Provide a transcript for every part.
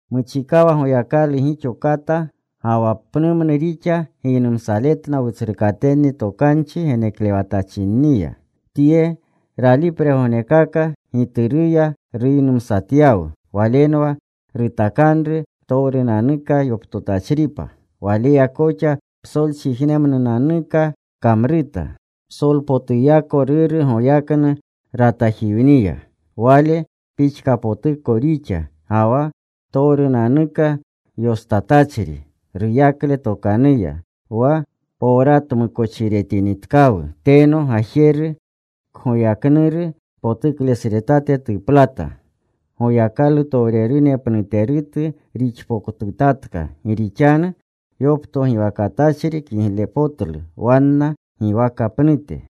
Muchikawa Goyakalu gixo kata ga wa pnumnu rixa giynumsaletna wutsrukatenni tokanchi geneklewatachinniya. Tye ralipregognekaka, Gituruya ruynumsatyawu. Walenwa rutakanru ptowrunanuka yoptotachripa. Waleya koxa psolchijnemnunanukaaka kamruta. Psolpotuyako Ruru goyaknu ratajiwniya. Wale pixkapotuko rixa, ga wa ptowrupotunanuka yostatachri ruyakle tokanuya. Wa powratmukochiretinitkawu, teno Gajeru kgoyagknuru potuklesretate tuplata. Goyakalutowrerune pnuterutu rixpotutatka, gi rixanu yoptogiwakatachri kiglepotlu wanna giwaka pnute.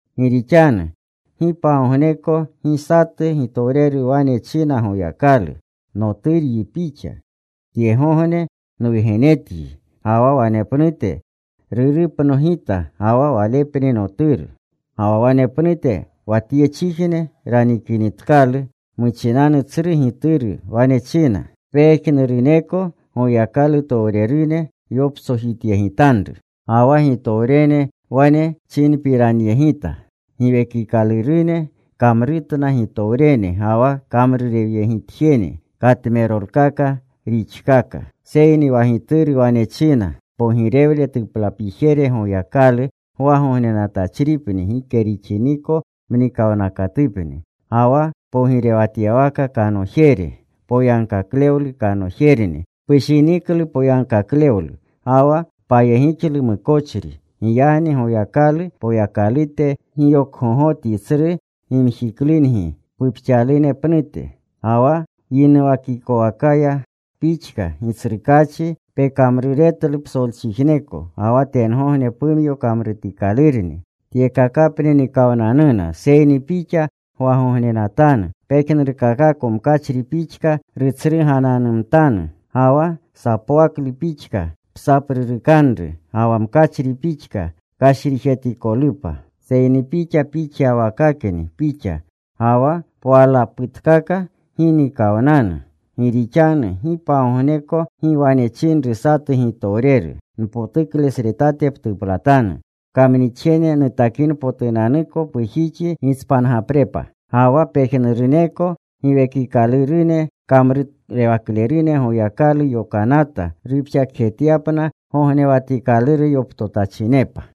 Gi rixanu gi pagogneko gi satu gitowreru wane china Goyakalu: “Noturyi Pixa; tyegogne nwugenetyi.” Ga wa wanepnute: “Rurupno Gita ga wa Walepni Noturu.” Ga wa wanepnute wa tyechijne ranikinitkalu muchinanu tsru Gituru, wane china: “Pejnuruneko Goyakalutowrerune yoptsojityegitanru.” Ga wa gitowrene wane chinpiranyegita: Giwekikalurune kamrutna gitowrene ga wa kamrurewyegitjene katmerolkaka rixkaka. Seyni wa Gituru wane china: “Pogirewle tuplapijere, Goyakalu, gwagognenatachripni gike rixiniko mnikawnakatupni. Ga wa pogirewatyawaka kanojere, poyagkaklewlu kanojerni. Pushiniklu poyagkaklewlu, ga wa payegixlu mukochri. Giyagni Goyakalu, Poyakalute, giyokgogotyi tsru gimjiklungi pupxalune pnute. Ga wa yinuwakikowakaya Pixa, Gitsrukaachi, pekamruretlu psolchijneko. Ga wa tengogne pumyo kamrutikalurni. Tyekakapni nikawnanuna, seyni Pixa gwagognenatanu. Pejnurkakako mkachri pixka rutsrugananumtanu. Ga wa sapwaklu pixka psaprurukanru. Ga wa mkachri pixka kashrijetikolupa. Seyni Pixa pixyawakakni Pixa. Ga wa pwalaputkaka gi nikawnanu.” Gi rixanu gi pagogneko gi wane chinru satu gitowreru: “Npotuklesretate ptuplatanu, pkamnixjene nutakinpotunanuko pujixi gitspangaprepa.” Ga wa pejnuruneko giwekikalurune kamrurewaklerunni Goyakalu yokanata rupxakjetyapna gognewatikaluru yoptotachinepa.